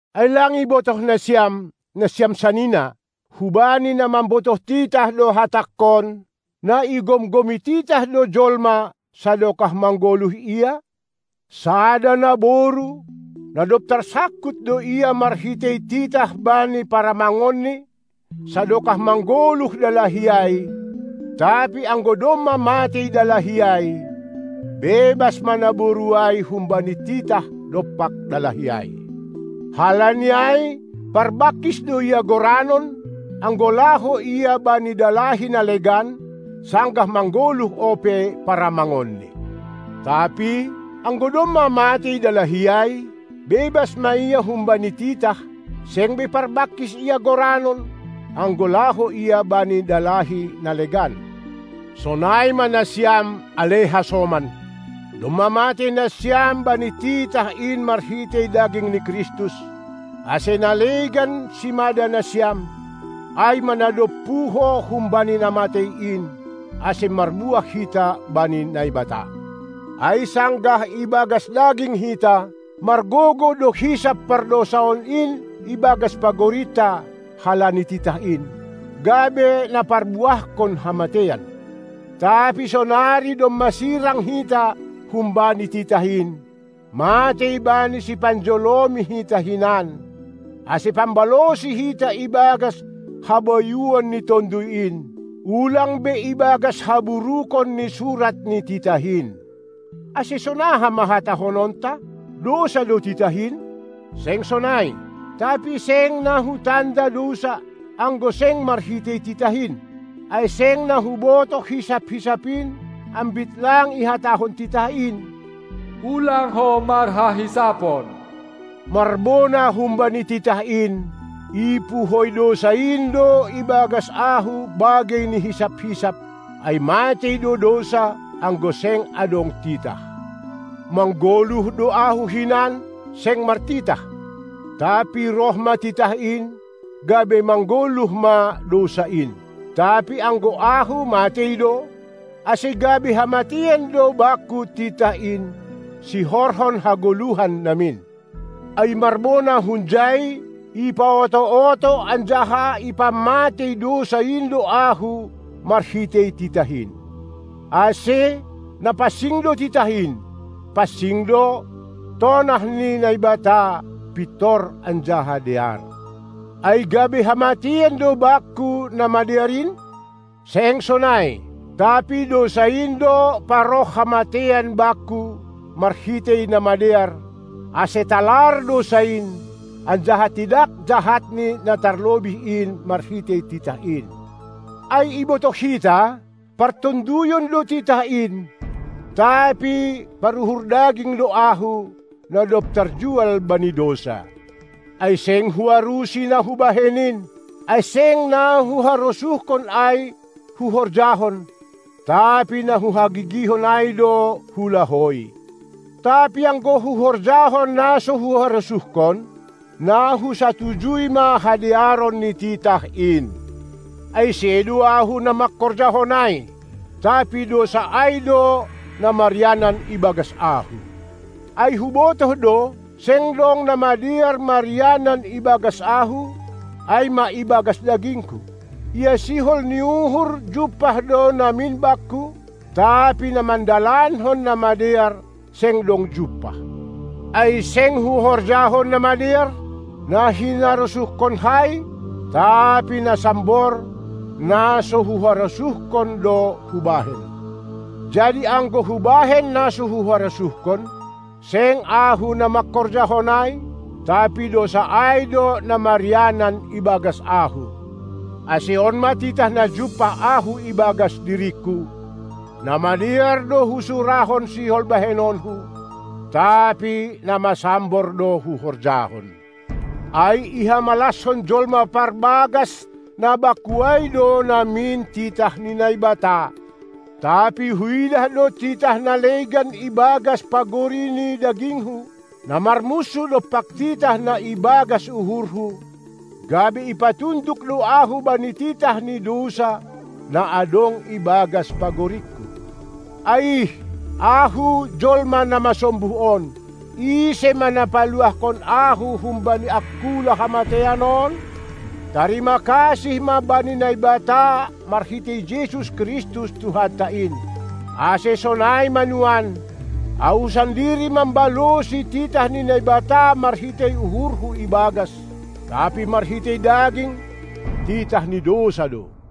Ai lang ibotoh nasiam, nasiam sanina (hubani na mambotoh titah do hatangkon), na igomgomi titah do jolma, sadokah manggoluh ia? Sada naboru, na dob tarsangkut do ia marhitei titah bani paramangonni, sadokah manggoluh dalahi ai, tapi anggo domma matei dalahi ai, bebas ma naboru ai humbani titah dompak dalahi ai. Halani ai parbangkis do ia goranon, anggo laho ia bani dalahi na legan, sanggah manggoluh ope paramangonni. Tapi, anggo domma matei dalahi ai, bebas ma ia humbani titah, seng be parbangkis ia goranon, anggo laho ia bani dalahi na legan. Sonai ma nasiam, ale hasoman, domma matei nasiam bani titah in marhitei daging ni Kristus, ase na legan simada nasiam, ai ma na dob puho humbani na matei in, ase marbuah hita bani Naibata. Ai, sanggah ibagas daging hita, margogoh do hisap pardousaon in ibagas pagorinta halani titah in, gabe na parbuahkon hamateian. Tapi sonari domma sirang hita humbani titah in, matei bani sipanjolomi hita hinan, ase pambalosi hita ibagas habayuon ni Tonduy in, ulang be ibagas haburukon ni surat ni titah in. Ase sonaha ma hatahononta? Dousa do titah in? Seng sonai! Tapi seng na hutanda dousa, anggo seng marhitei titah in. Ai seng na hubotoh hisap-hisap in, ambit lang ihatahon titah in: Ulang ho marhahisapon. Marbona humbani titah in, ipuhoi dousa in do ibagas ahu bagei ni hisap-hisap; ai matei do dousa, anggo seng adong titah. Manggoluh do ahu hinan, seng martitah. Tapi roh ma titah in, gabe manggoluh ma dousa in. Tapi anggo ahu matei do, ase gabe hamateian do bakku titah in, sihorhon hagoluhan namin. Ai marbona hunjai, ipaoto-oto anjaha ipamatei dousa in do ahu marhitei titah in. Ase na pansing do titah in, pansing do tonah ni Naibata, pintor anjaha dear. Ai gabe hamateian do bakku na madear in? Seng sonai! Tapi dousa in do paroh hamateian bakku marhitei na madear, ase talar dousa in, anjaha tidak jahatni na tarlobih in marhitei titah in. Ai ibotoh hita, partonduyon do titah in; tapi paruhur daging do ahu, na dob tarjual bani dousa. Ai seng huarusi na hubahen in; ai seng na huharosuhkon ai huhorjahon, tapi na huhagigihon ai do hulahoi. Tapi anggo huhorjahon na so huharosuhkon, na husatujui ma hadearon ni titah in. Ase sedo ahu, na mangkorjahon ai, tapi dousa ai do na marianan ibagas ahu. Ai hubotoh do, seng dong na madear marianan ibagas ahu, ai ma ibagas dagingku. Ia sihol ni uhur jumpah do namin bakku, tapi na mandalankon na madear seng dong jumpah. Ai seng huhorjahon na madear, na hinarosuhkonkai, tapi na sambor, na so huharosuhkon do hubahen. Jadi anggo hubahen na so huharosuhkon, seng ahu na mangkorjahon ai, tapi dousa ai do na marianan ibagas ahu. Ase on ma titah na jumpah ahu ibagas diringku: Na madear do husurahon sihol bahenonku, tapi na masambor do huhorjahon. Ai ihamalaskon jolma parbagas na bakku ai do namin titah ni Naibata, tapi huidah do titah na legan ibagas pagori ni dagingku, na marmunsuh dompak titah na ibagas uhurhu, gabe ipatunduk do ahu bani titah ni dousa, na adong ibagas pagoringku. Aih, ahu jolma na masombuh on. Ise ma na paluahkon ahu humbani angkula hamateian on? Tarima kasih ma bani Naibata marhitei Jesus Kristus Tuhanta in. Ase, sonai ma nuan: Ahu sandiri mambalosi titah ni Naibata marhitei uhurhu ibagas, tapi marhitei daging, titah ni dousa do.